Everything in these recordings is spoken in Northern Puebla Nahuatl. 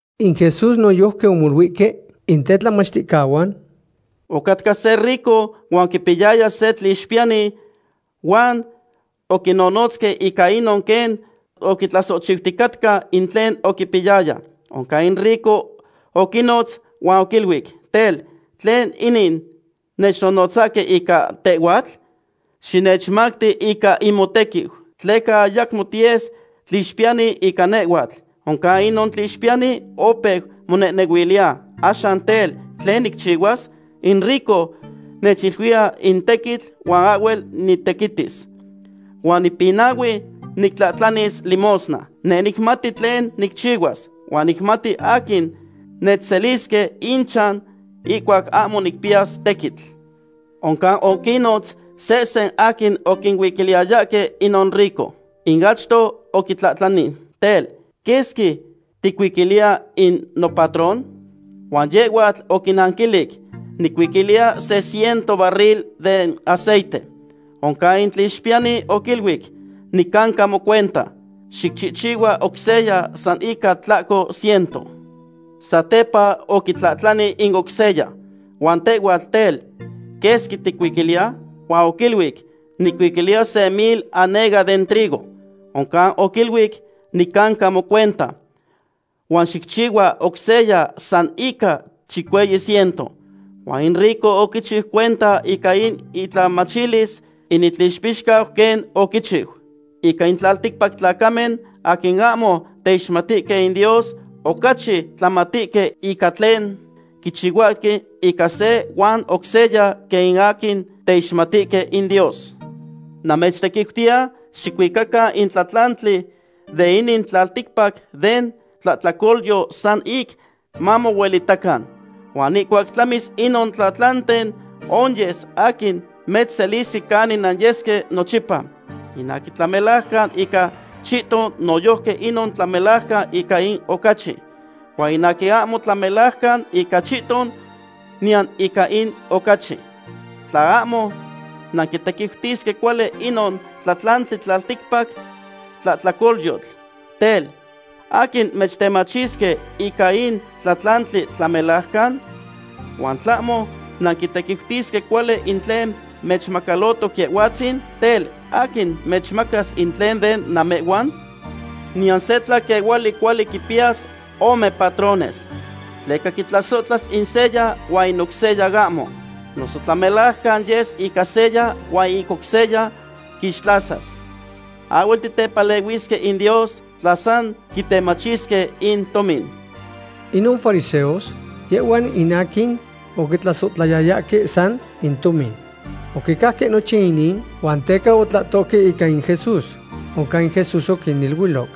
In Jesús noyojqui omoluihque in tetlamachticahuan: ―Ocatca se rico huan oquipiyaya se tlixpiyani huan oquinonotzque ica inon quen oquitlasohchiuticatca in tlen oquipiyaya. Oncan in rico oquinotz huan oquiluic: “Tel, ¿tlen inin nechnonotzahque ica tehhuatl? Xinechmacti ica in motequiu, tleca ayacmo tiyes tlixpiyani ica nehhuatl.” Oncan inon tlixpiyani opeu monehnehuiliya: “Axan tel, ¿tlen nicchihuas? In rico nechcuiliya in tequitl huan ahhuel nitequitis. Huan nipinahui nictlahtlanis limosna. Neh nicmati tlen nicchihuas, huan nicmatis aquin nechselisque inchan ihcuac ahmo nicpiyas tequitl.” Oncan oquinnotz sehsen aquin oquihuiquiliyayahque inon rico. In achto oquitlahtlani: “Tel, ¿quesqui ticuiquiliya in nopatrón?” Huan yehhuatl oquinanquilic: “Nicuiquiliya se ciento barril den aceite.” Oncan in tlixpiyani oquiluic: “Nicanca mocuenta. Xicchihchihua oc seya san ica tlahco ciento.” Satepa oquitlahtlani in oc seya: “Huan tehhuatl, tel, ¿quesqui ticuiquiliya?” Huan oquiluic: “Nicuiquiliya se mil anega den trigo.” Oncan oquiluic: “Nicanca mocuenta. Huan xicchihchihua oc seya san ica chicueyi ciento.” Huan in rico oquichiu cuenta ica in itlamachilis in itlixpixcau quen oquichiu. Ica in tlalticpac tlacamen aquin ahmo teixmatihque in Dios ocachi tlamatihque ica tlen quichihuahque ica se huan oc seya quen in aquin teixmatihque in Dios. ’Namechtequiutiya xicuican in tlatlantli de inin tlalticpac den tlahtlacolyotl san ic mamohuelitacan. Huan ihcuac tlamis inon tlatlanten onyes aquin mechselisque canin nanyesque nochipa. ’In aquin tlamelajcan ica chihton noyojqui inon tlamelajcan ica in ocachi. Huan in aquin ahmo tlamelajcan ica chihton niyan ica in ocachi. Tla ahmo nanquitequiutisque cuali inon tlatlantli tlalticpac tlahtlacolyotl, tel, ¿aquin mechtemachisque ica in tlatlantli tlamelajcan? Huan tlahmo nanquitequiutisque cuali in tlen mechmacalotoc Yehhuatzin, tel, ¿aquin mechmacas in tlen de namehhuan? ’Niyan se tlaquehuali cuali quipiyas ome patrónes. Tleca quitlasohtlas in seya huan in oc seya ahmo. Noso tlamelajcan yes ica seya huan in oc seya quixtlasas. Ahhuel titepalehuisque in Dios tla san quitemachisque in tomin. Inon fariseos, yehhuan in aquin oquitlasohtlayayahque san in tomin. Oquicajque nochin inin huan teca otlahtohque ica in Jesús. Oncan in Jesús oquiniluiloc: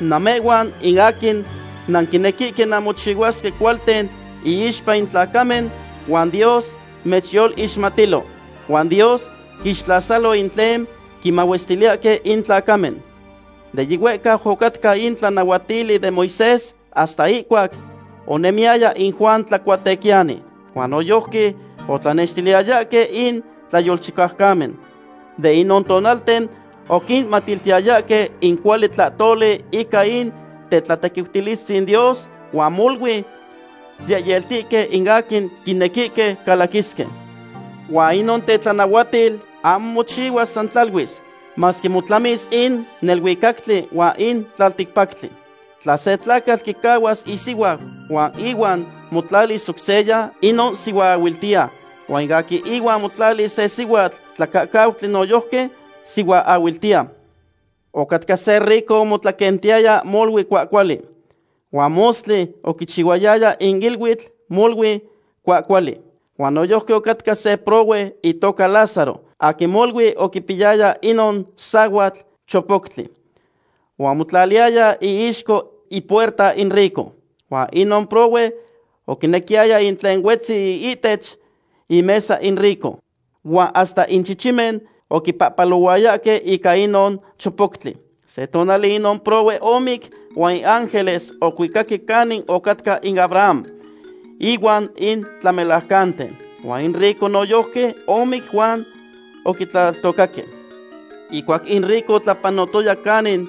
―Namehhuan in aquin nanquinequihque nanmochihuasque cualten iixpa in tlacamen, huan Dios mechyoloixmatilo. Huan Dios quixtlasalo in tlen quimahuestiliyahque in tlacamen. ’De yihuehcau ocatca in tlanahuatili den Moisés hasta ihcuac onemiyaya in Juan Tlacuatequiyani. Huan noyojqui otlanextiliyayahque in tlayolchicaucamen. De inon tonalten oquinmatiltiyayahque in cuali tlahtoli ica in tetlatequiutilistzin Dios, huan molui yehyeltihque in aquin quinequihque calaquisque. ’Huan inon tetlanahuatil ahmo mochihuas san tlaluis, masque motlamis in neluicactli huan in tlalticpactli. ’Tla se tlacatl quicahuas isihuau huan ihuan motlalis oc seya, inon sihuaahuiltiya. Huan in aquin ihuan motlalis se sihuatl tlacacauqui noyojqui sihuaahuiltiya. ’Ocatca se rico omotlaquentiyaya molui cuahcuali, huan mostli oquichihuayaya in iluitl molui cuahcuali. Huan noyojqui ocatca se prohue itoca Lázaro, aquin molui oquipiyaya inon sahuatl chopoctli. Huan omotlaliyaya iixco ipuerta in rico. Huan inon prohue oquinequiyaya in tlen huetzi ihtech imesa in rico. Huan hasta in chichimen oquipahpalohuayahque ica inon chopoctli. Se tonali inon prohue omic, huan in ángeles ocuicaque canin ocatca in Abraham inuan in tlamelajcanten. Huan in rico noyojqui omic huan oquitlaltocaque. Ihcuac in rico otlapanotoya canin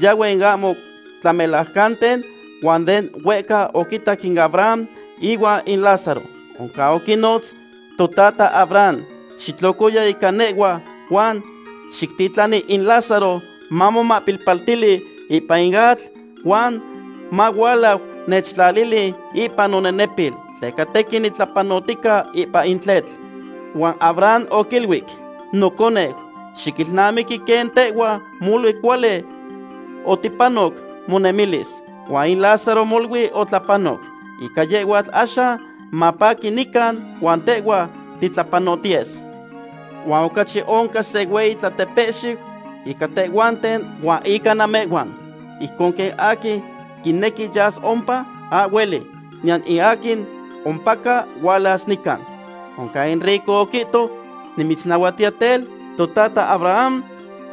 yahue in ahmo tlamelajcanten huan de huehca oquitac in Abraham ihuan in Lázaro. Oncan oquinotz: “Totata Abraham, xitlocoya ica nehhua huan xictitlani in Lázaro mamomahpilpaltili ipan in atl huan mahualau nechtlalili ipan nonenepil, tleca tequin nitlapanotica ipan in tletl.” Huan Abraham oquiluic: “Noconeu, xiquilnamiqui quen tehhua molui cuali oticpanoc monemilis, huan in Lázaro molui otlapanoc. Ica yehhuatl axan mapaqui nican huan tehhua titlapanohtiyes. Huan ocachi oncan se hueyi tlatepehxiu ica tehhuanten huan ica namehhuan. Ijcon quen aquin quinequi yas ompa, ahhueli, niyan in aquin ompaca hualas nican.” Oncan in rico oquihto: “Nimitznahuatiya tel, totata Abraham,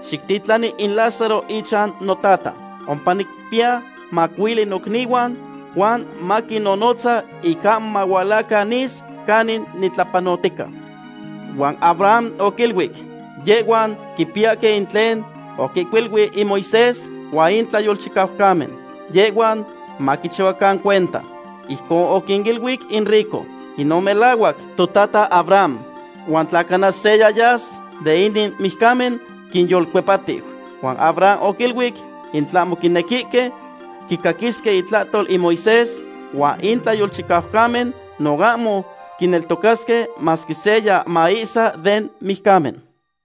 xictitlani in Lázaro ichan notata. Ompa niquimpiya macuili nocnihuan, huan maquinnonotza ic ahmo mahualacan nis canin nitlapanotica.” Huan Abraham oquiluic: “Yehhuan quipiyahque in tlen oquinihcuilui in Moisés huan in tlayolchicaucamen. ¡Yehhuan maquichihuacan cuenta!” Ijcon oquinanquilic in rico: “Inon melahuac, totata Abraham. Huan tla cana seya yas den inin mijcamen, quinyolcuepatiu.” Huan Abraham oquiluic: “In tlahmo quinequihque quicaquisque intlahtol in Moisés huan in tlayolchicaucamen, no ahmo quineltocasque, masque seya maihsa den mijcamen.”